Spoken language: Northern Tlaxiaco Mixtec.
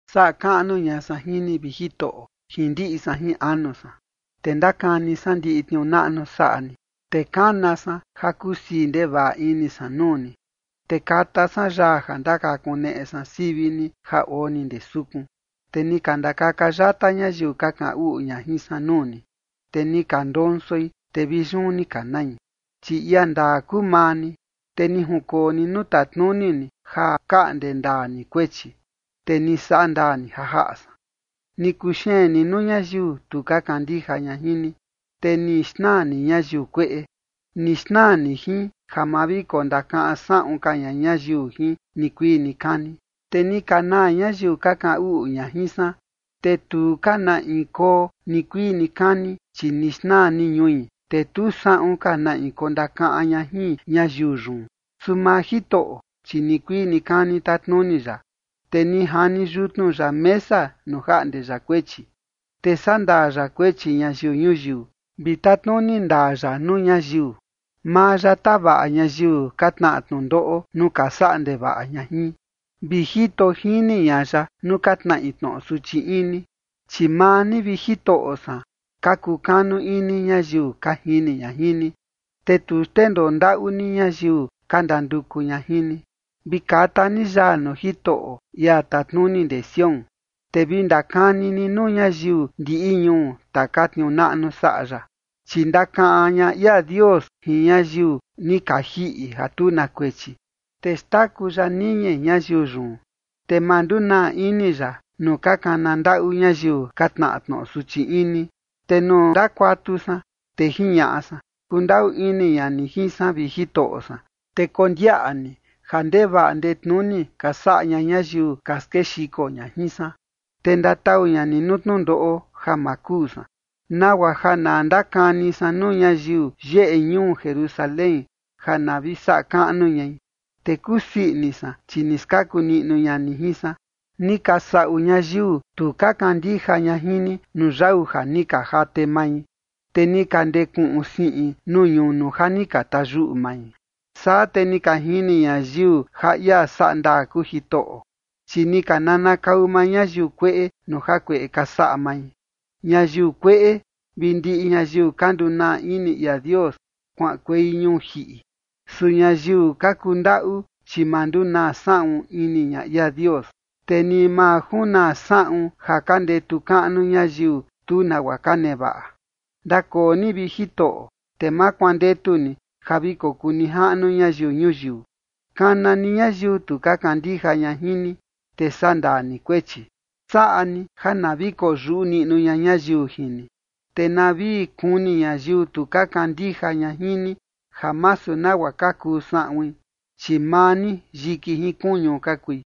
Saꞌa kaꞌnu ña san jin ni, vi Jitoꞌo, jin ndiꞌi san jin anu san, te ndakani san ndiꞌi tniuu naꞌnu saꞌa ni. Te kana san ja kusii ndevaꞌa ini san nuu ni, te kata san yaa ja ndakakuneꞌe san sivi ni ja oo ni ndee sukun. Te ni ka ndakaka yata ñayiu ka kaꞌan uꞌu ña jin san nuu ni, te ni ka ndonsoi, te vi yun ni ka nai. Chi ia ndaa kuu maa ni, te ni junkoo ni nuu tatnuni ni ja kaꞌnde ndaa ni kuechi, te ni saꞌa ndaa ni ja jaꞌa san. Ni kuxeen ni nuu ñayiu tu ka kandija ña jin ni, te ni xnaa ni ñayiu kueꞌe, ni xnaa ni jin, ja ma vi kondakaꞌan saꞌun ka ña ñayiu jin nikuii nikani. Te ni ka naa ñayiu ka kaꞌan uꞌu ña jin san, te tu ka na in koo nikuii nikani, chi ni xnaa ni ñui, te tu saꞌun ka na in kondakaꞌan ña jin ñayiu yun. Su maa Jitoꞌo, chi nikuii nikani tatnuni ya, te ni jani yutnu ya mesa nuu jaꞌnde ya kuechi. Te sandaa ya kuechi ñayiu ñuyiu vi tatnuni ndaa ya nuu ñayiu. Maa ya tavaꞌa ñayiu ka tnaꞌa tnundoꞌo nuu ka saꞌa ndevaꞌa ña jin, vi jito jini ña ya nuu ka tnaꞌi tnoꞌo suchi ini. Chi maa ni, vi Jitoꞌo san, ka kukanu ini ñayiu ka jini ña jin ni, te tu xndendoo ndaꞌu ni ñayiu ka ndanduku ña jin ni. Vi kata ni yaa nuu Jitoꞌo, ia tatnuni ndee Sión, te vi ndakani ni nuu ñayiu ndiꞌi ñuu taka tniuu naꞌnu saꞌa ya. Chi ndakaꞌan ña ia Dios jin ñayiu ni ka jiꞌi ja tu na kuechi, te xtaku ya niñi ñayiu yun, te ma ndunaa ini ya nuu ka kana ndaꞌu ñayiu ka tnaꞌa tnoꞌo suchi ini. Te nuu ndakuatu san, te jiñaꞌa san: “Kundaꞌu ini ña ni jin san, vi Jitoꞌo san, te kondiaꞌa ni ja ndevaꞌa ndetnuni ka saꞌa ña ñayiu ka skexiko ña jin san, te ndatau ña ni nuu tnundoꞌo ja ma kuu san, nagua ja na ndakani san nuu ñayiu yeꞌe ñuu Jerusalén ja na vi saꞌa kaꞌnu ñai, te kusii ini san, chi ni skaku niꞌnu ña ni jin san”. Ni ka saꞌu ñayiu tu ka kandija ña jin ni nuu yau ja ni ka jate mai, te ni ka ndekuꞌun siꞌin nuu ñunu ja ni ka tayuꞌu mai. Saa te ni ka jini ñayiu ja ia saꞌa ndaa kuu Jitoꞌo, chi ni ka nanakau maa ñayiu kueꞌe nuu jakueꞌe ni ka saꞌa mai. Ñayiu kueꞌe vi ndiꞌi ñayiu ni ka ndunaa ini ia Dios kuaꞌankuei ñuu jiꞌi. Su ñayiu ka kundaꞌu, chi ma ndunaa saꞌun ini ña ia Dios, te ni ma junaa saꞌun ja ka ndetu kaꞌnu ñayiu tu nagua ka nevaꞌa. Ndakoo ni, vi Jitoꞌo, te ma kuandetu ni ja vi kokuu nijaꞌnu ñayiu ñuyiu. Kana ni ñayiu tu ka kandija ña jin ni, te sandaa ni kuechi. Saꞌa ni ja na vi koyuꞌu niꞌnu ña ñayiu jin ni, te na vi kuni ñayiu tu ka kandija ña jin ni ja masu nagua ka kuu saꞌuin, chi maa ni yiki jin kuñu ka kui.